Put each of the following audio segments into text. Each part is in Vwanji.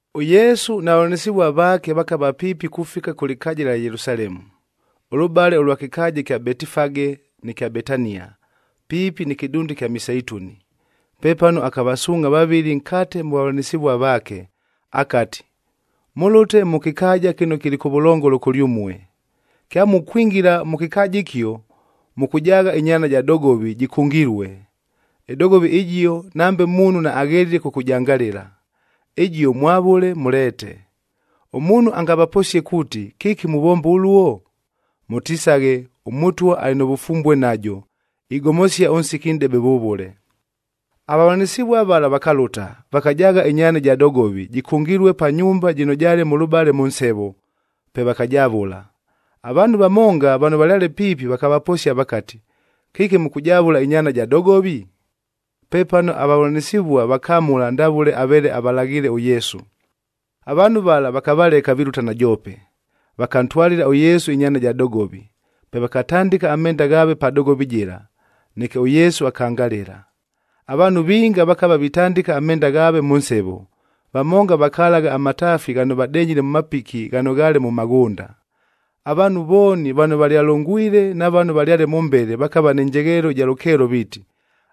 ɄYesu na vavʉlanɨsɨvua vaake vakava piipi kufika kʉ lɨkaaja ɨlya Yelusalemu, ʉlʉbale ʉlwa kɨkaaja ɨkya Betifage nɨ kya Betania, piipi nɨ kɨdunda ɨkya Miseituni.a Pepano akavasuungʼha vavɨlɨ nkate mʉ vavʉlanɨsɨvua vaake, akati, “Mʉlʉte mʉ kɨkaaja kɨno kɨlɨ kʉvʉlongolo kʉlyʉmue. Kyamukwingila mʉ kɨkaaja ɨkio, mʉkʉjaagha ɨnyaana ja dogovi jɨkʉngilue. Ɨdogovi ɨjio, nambe muunhu naaghelile kʉkʉjangalɨla. Ɨjio mwavʉle mʉleete. Ʉmuunhu angavaposie kuuti, ‘Kɨki muvomba ʉluo?’ Mʉtisaghe, ‘ɄMʉtwa alɨ nʉ vʉfumbue najo, igomosia ʉnsiki nʼdebe vʉvʉle.’” Avavʉlanɨsɨvua vala vakalʉta, vakajaagha ɨnyaana ɨja dogovi, jɨkʉngilue pa nyumba jɨno jaale mʉlʉbale mʉ nsevo, pe vakajavʉla. Avaanhu vamonga vano valyale piipi vakavaposia vakati, “Kɨki mʉkʉjavʉla ɨnyaana ja dogovi?” Pepano avavʉlanɨsɨvua vakamʉla ndavʉle aveele avalaghiile ʉYesu. Avaanhu vala vakavaleka vilʉta najoope. Vakantwalɨla ʉYesu ɨnyaana ja dogovi,b pe vakatandɨka amenda ghaave pa dogovi jɨla, neke ʉYesu akangalɨla. Avaanhu vinga vakava vitandɨka amenda ghaave mʉ nsevo, vamonga vakalagha amataafi ghano vadenyile mʉ mapiki ghano ghaale mʉ maghʉnda. Avaanhu vooni vano valyalongwile na vano valyale mʉmbele vakava nɨ njegheelo ɨja lʉkeelo viiti,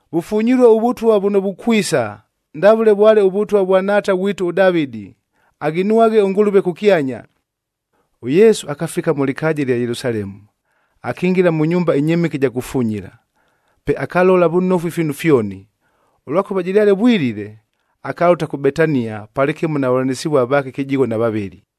Vʉfunyilue ʉVʉtwa vʉno vukwisa, ndavʉle vwale ʉvʉtwa vwa nhaata ghwitu ʉDavɨdi!e Aghinwaghe ʉNgʉlʉve kʉkyanya!” ɄYesu akafika mʉ lɨkaaja ɨlya Yelusalemu, akingila mʉ nyumba ɨnyɨmɨke ɨja kufunyila.f Pe akalola vʉnofu ifiinu fyoni. Ʉlwakʉva jɨlyale vwilile, akalʉta kʉ Betania palɨkɨmo na vavʉlanɨsɨvua vaake kɨjigho na vavɨlɨ.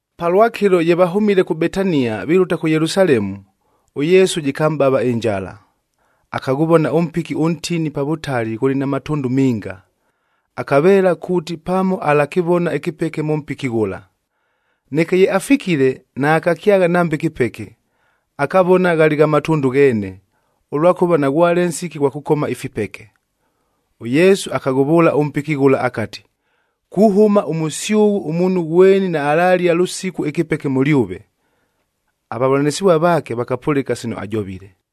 Palwakɨlo ye vahʉmile kʉ Betania vilʉta kʉ Yelusalemu, ʉYesu jɨkamʼbava ɨnjala. Akaghʉvona ʉmpiki ʉntini pa vʉtali ghʉlɨ na matʉndʉ minga. Akaveela kuuti pamo alakɨvona ɨkɨpeke mʉ mpiki ghʉla. Neke ye afikile, naakakyagha nambe kɨpeke, akavona ghalɨ gha matʉndʉ gheene, ʉlwakʉva naghwale nsiki ghwa kʉkoma ifipeke. ɄYesu akaghʉvʉʉla ʉmpiki ghʉla akati, “Kuhʉma ʉmʉsyʉghʉ ʉmuunhu ghweni naalalia lʉsiku ɨkɨpeke mʉlyʉve.” Avavʉlanɨsɨvua vaake vakapʉlɨka sino ajovile.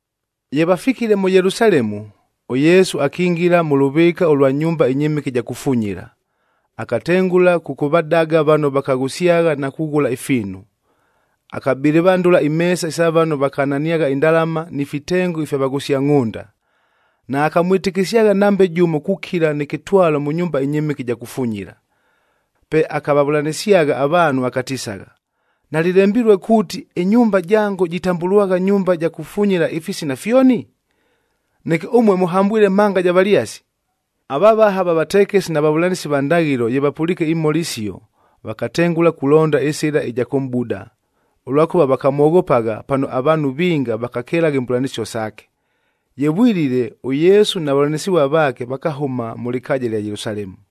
Ye vafikile mʉ Yelusalemu, ʉYesu akingila mʉ lʉvɨɨka ʉlwa nyumba ɨnyɨmɨke ɨja kufunyila, akatengʉla kʉkʉvadaga vano vakaghʉsyagha na kughʉla ifiinu. Akabɨlɨvandʉla imeesa isa vano vakananiagha indalama ni fitengo ifya vaghʉsia ngʼhʉnda. Naakamwɨtɨkɨsyagha nambe jʉmo kukila nɨ kɨtwalo mʉ nyumba ɨnyɨmɨke ɨja kufunyila. Pe akavavʉlanɨsyagha avaanhu akatisagha, “Nalɨlembilue kuuti, ‘Ɨnyumba jango jitambʉlwagha nyumba ja kufunyila ifisina fyoni’?g Neke ʉmue mʉhambwile ‘mhanga ja valyasi!’h” Avavaha va vatekesi na vavʉlanɨsi va ndaghɨlo, ye vapʉliike imhola isio, vakatengʉla kulonda ɨsɨla ɨja kʉmʼbuda, ʉlwakʉva vakamwoghopagha pano avaanhu vinga vakakelagha imbʉlanɨsio saake. Ye vwilile, ʉYesu na vavʉlanɨsɨvua vaake vakahʉma mʉ lɨkaaja ɨlya Yelusalemu.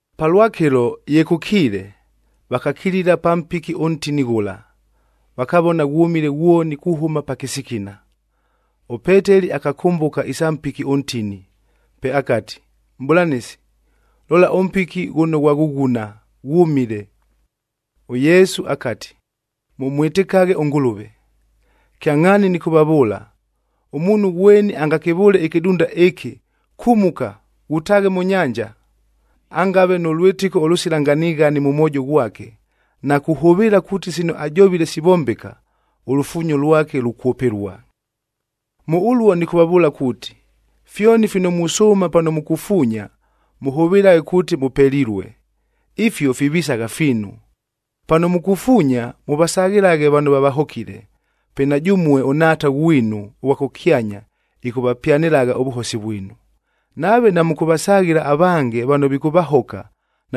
Palwakɨlo, ye kʉkiile, vakakilila pa mpiki ʉntini ghʉla, vakavona ghwʉmile ghwoni kuhʉma pa kɨsikina. ɄPeteli akakʉmbʉka isa mpiki ʉntini, pe akati, “Mʼbʉlanɨsi, lola ʉmpiki ghʉno ghwaghʉghuna, ghwʉmile!” ɄYesu akati, “Mʉmwɨtɨkaghe ʉNgʉlʉve. Kyangʼhaani nɨkʉvavʉʉla, ʉmuunhu ghweni angakɨvʉʉle ɨkɨdunda ɨkɨ, ‘Kumuka, ghutaaghe mʉ nyanja,’ angave nʉ lwɨtɨko ʉlʉsila nganighani mʉ mwojo ghwake, na kuhʉvɨɨla kuuti sino ajovile sivombeka, ʉlufuunyo lwake lukwʉpɨlua. “Mʉ ʉluo nɨkʉvavʉʉla kuuti, fyoni fino musʉʉma pano mukufuunya, mʉhʉvɨlaghe kuuti mʉpelilue, ifio fivisagha fiinu. Pano mukufuunya, mʉvasaghɨlaghe vano vavahokile, pe na jʉmue ʉNhaata ghwinu ʉghwa kʉkyanya ɨkʉvapyanɨlagha ʉvʉhosi vwinu. Nave namʉkʉvasaghɨla avange vano vikʉvahoka,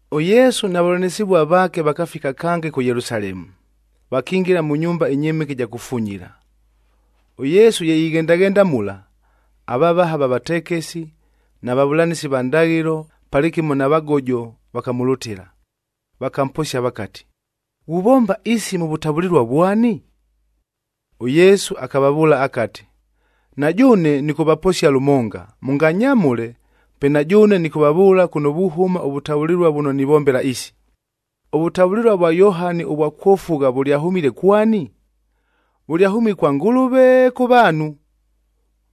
ɄYesu na vavʉlanɨsɨvua vaake vakafika kange kʉ Yelusalemu, vakingila mʉ nyumba ɨnyɨmɨke ɨja kufunyila. ɄYesu ye ighendaghenda mula, avavaha va vatekesi na vavʉlanɨsi va ndaghɨlo palɨkɨmo na vagojo vakamʉlʉtɨla. Vakamposia vakati, “Ghuvomba isi mʉ vʉtavʉlɨlua vwani?” ɄYesu akavavʉʉla akati, “Na jʉʉne nɨkʉvaposia lʉmonga, mʉnganyamʉle, pe na jʉʉne nɨkʉvavʉʉla kʉno vuhʉma ʉvʉtavʉlɨlua vʉno nivombela isi. Ʉvʉtavʉlɨlua vwa Yohani ʉvwa kwofugha vʉlyahʉmile kwani? Vʉlyahʉmile kwa Ngʉlʉve, kʉ vaanhu?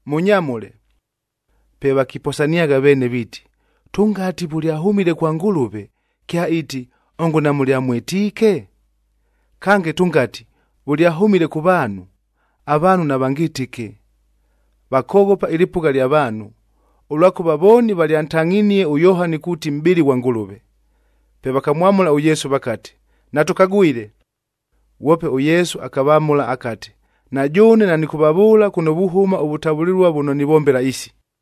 Mʉnyamʉle.” Pe vakiposaniagha veene viiti, “Tʉngati, ‘Vʉlyahʉmile kwa Ngʉlʉve,’ kyaiiti, ‘Ongo namʉlyamwɨtiike?’ Kange tʉngati, ‘Vʉlyahʉmile kʉ vaanhu,’ avaanhu navangɨtɨke.” Vakoghopa ɨlɨpʉgha lya vaanhu, ʉlwakʉva vooni valyantangʼhinie ʉYohani kuuti mʼbɨli ghwa Ngʉlʉve. Pe vakamwamʉla ʉYesu vakati, “Natʉkagwile.” Ghwope ʉYesu akavamʉla akati, “Na jʉʉne nanɨkʉvavʉʉla kʉno vuhʉma ʉvʉtavʉlɨlua vʉno nivombela isi.”